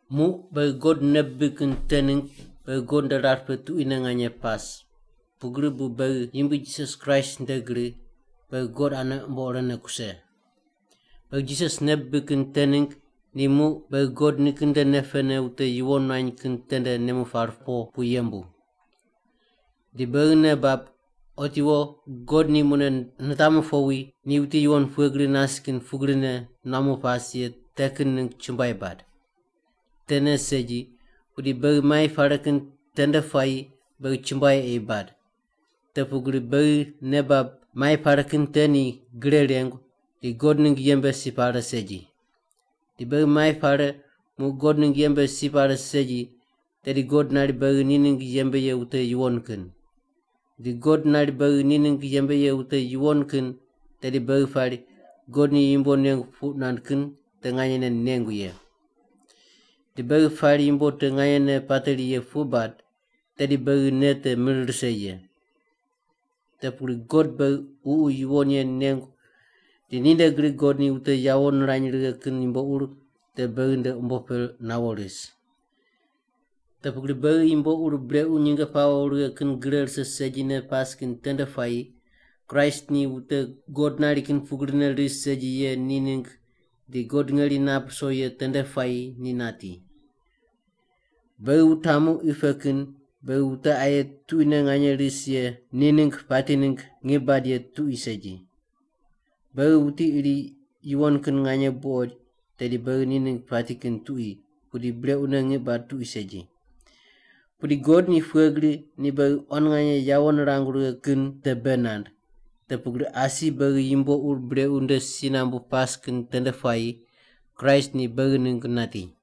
Muq beghi God nei bibig kin te ningg beghi God nde rar pe tuquine nganye pas, pugri bu beghi Yumbui Jisas Kraist nde gri beghi God ane umbo irene kuse. Beghi Jisas nei bibig kin te ningg ni muq beghi God nikin nde nei pene wute yuwon nuany kin tende nemu par po pu yembu. Di beghi nei bab otiwo God ni mune nitamu powi ni wuti yuwon pughe gri nas kin pugrine nuamu pas ye te kin ningg chumbuai bad! Tene segi, pudi beghi mai pare kin tende puayi beghi chumbuai ei bad, te pugri beghi nei bab mai pare kin te ni gre rengu di God ningg yembe si pare segi. Di beghi mai pare muq God ningg yembe si pare segi tedi God nari beghi ni ningg yembe ye wute yuwon kin. Di God nari beghi ni ningg yembe ye wute yuwon kin tedi beghi pari God ni yumbo nengu puq nand kin te nganyene nengu ye. Di beghi pari yumbo te nganyene pateri ye puq bad, tedi beghi nei te mir rise ye. Te pugri God beghi Ququ Yuwon Ye nengu di ninde gri God ni wute yawo nirany righe kin yumbo ur te beghi nde umbo pe nawo ris. Te pugri beghi yumbo ur brequ nyinge pawo righe kin gre rise segine pas kin tende puayi Kraist ni wute God nari kin pugrine ris segi ye ni ningg di God ngeri nap ruso ye tende puayi ni nati. Beghi wutamu qi pe kin beghi wute aye tuquine nganye ris ye ni ningg pati ningg ngiq bad ye tuqui segi. Beghi wuti iri yuwon kin nganye buqoid tedi beghi ni ningg pati kin tuqui pudi brequne ngiq bad tuqui segi. Pudi God ni pughe gri ni beghi quan nganye yawo nirangu righe kin te bei nand, te pugri asi beghi yumbo ur brequ nde si nambune pas kin tende puayi Kraist ni beghi ningg nati!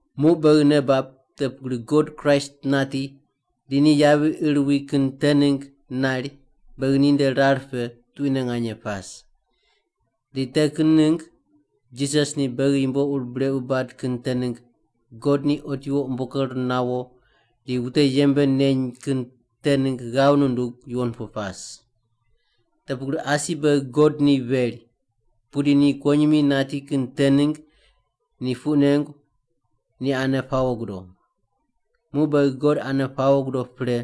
Muq beghi nei bab te pugri God Kraist nati di ni yavi ir wi kin te ningg nari beghi ninde rar pe tuquine nganye pas. Di te kin ningg Jisas ni beghi yumbo ur brequ bad kin te ningg God ni otiwo umbo ker nawo di wute yembe neny kin te ningg ghav nundug yuwon pu pas. Te pugri asi beghi God ni veri, pudi ni kuwonyimi nati kin te ningg ni puq nengu ni ane pawo gudo. Muq beghi God ane pawo gudo pre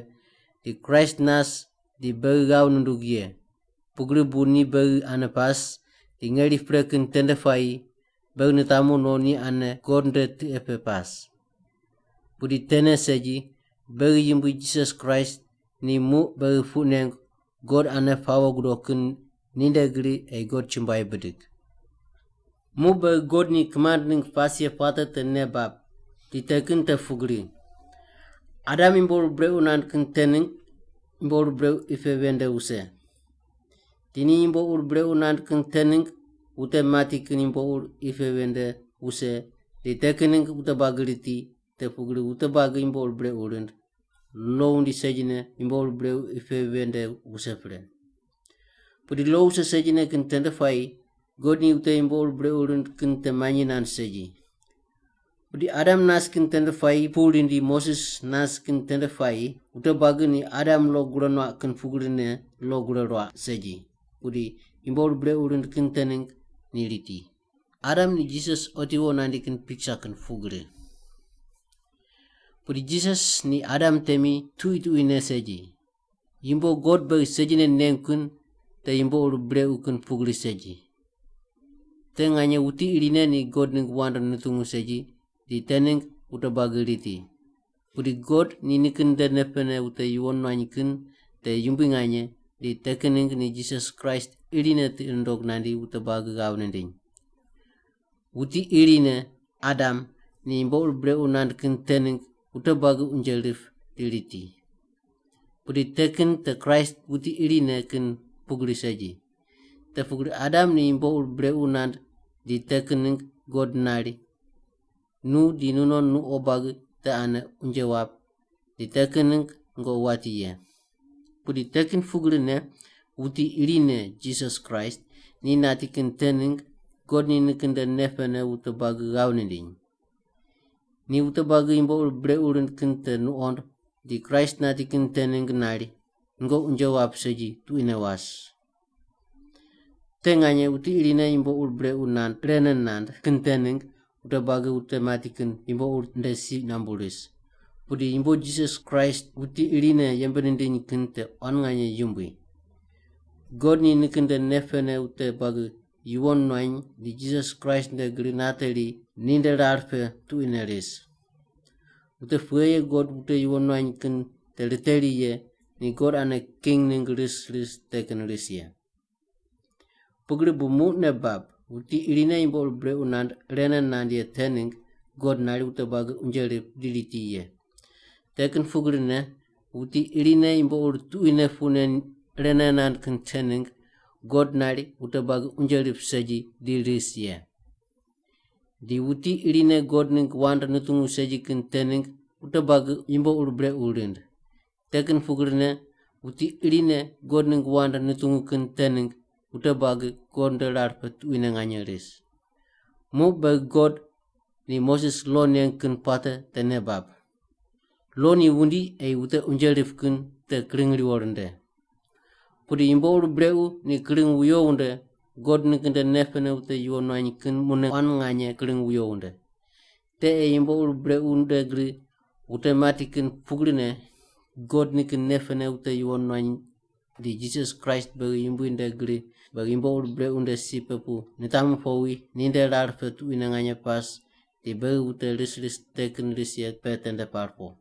di Kraist nas di beghi ghav nundug ye, pugri bu ni beghi ane pas di ngeri pre kin tende puayi beghi nitamu no ni ane God nde tiqe pe pas. Pudi tene segi, beghi Yumbui Jisas Kraist ni muq beghi puq nengu God ane pawo gudo kin ninde gri ei God chumbuai bidig. Muq beghi God ni kimand ningg pas ye puate te nei bab, di te kin te pugri: Adam yumbo ur brequ nand kin te ningg yumbo ur brequ qi pe ven nde wuse. Di ni yumbo ur brequ nand kin te ningg wute mati kin yumbo ur qi pe ven nde wuse di te kin ningg wute buagi riti, te pugri wute buagi yumbo ur brequ rind, lo wundi segine yumbo ur brequ qi pe ven nde wuse pre. Pudi lo wuse segine kin tende puayi God ni wute yumbo ur brequ rind kin te manyi nand segi. Pudi Adam nas kin tende puayi pu rindi Moses nas kin tende puayi wute buagi ni Adam lo gure nuaq kin pugri lo gure ruaq segi. Pudi yumbo ur brequ rind kin te ningg ni riti. Adam ni Jisas otiwo nandi kin piksa kin pugri. Pudi Jisas ni Adam temi tuqui tuquine segi, yumbo God beghi segine nengu kin te yumbo ur brequ kin pugri segi. Te nganye wuti irine ni God ningg wand nutungu segi di te ningg wute buagi riti. Pudi God ni nikin nde nei pene wute yuwon nuany kin te yumbui nganye di te kin ningg ni Jisas Kraist irine tiqi nundog nandi wute buagi ghav nindiny. Wuti irine, Adam, ni yumbo ur brequ nand kin te ningg wute buagi unje rip di riti. Pudi te kin te Kraist wuti irine kin pugri segi. Te pugri Adam ni yumbo ur brequ nand di te kin ningg God nari, “Nu di nunon nuqo buagi te ane unje wap di te kin ningg nungoqi wati ye.” Pudi te kin pugrine, wuti irine, Jisas Kraist, ni nati kin te ningg God ni nikin nde nei pene wute buagi ghav nindiny. Ni wute buagi yumbo ur brequ rind kin te nuqond di Kraist nati kin te ningg nari, “Nungoqi unje wap segi tuquine was.” Te nganye wuti irine yumbo ur brequ nand irene nand kin te ningg wute buagi wute mati kin yumbo ur nde si nambu ris, pudi yumbo Jisas Kraist wuti irine yembe nindiny kin te quan nganye yumbui! God ni nikin nde nei pene wute buagi yuwon nuany di Jisas Kraist nde gri nateri ni nde rar pe tuquine ris. Wute pughe ye God wute yuwon nuany kin te riteri ye ni God ane king ningg ris ris te kin ris ye. Pugri bu muq nei bab, wuti irine yumbo ur brequ nand irene nand ye te ningg God nari wute buagi unje rip di riti ye. Te kin pugrine, wuti irine yumbo ur tuquine puq nen irene nand kin te ningg God nari wute buagi unje rip segi di ris ye. Di wuti irine God ningg wand nutungu segi kin te ningg wute buagi yumbo ur brequ rind. Te kin pugrine, wuti irine God ningg wand nutungu kin te ningg wute buagi God nde rar pe tuquine nganye ris. Muq beghi God ni Moses lo neng kin puate te nei bab. Lo ni wundi ei wute unje rip kin te kring riwo rinde. Pudi yumbo ur brequ ni kring wuyo wunde God nikin nde nei pene wute yuwon nuany kin mune quan nganye kring wuyo wunde. Te ei yumbo ur brequ nde gri wute mati kin pugrine God nikin nei pene wute yuwon nuany di Jisas Kraist beghi Yumbui nde gri beghi yumbo ur brequ nde si pe pu nitamu powi ni nde rar pe tuquine nganye pas di beghi wute ris ris te kin ris ye pe tende par po.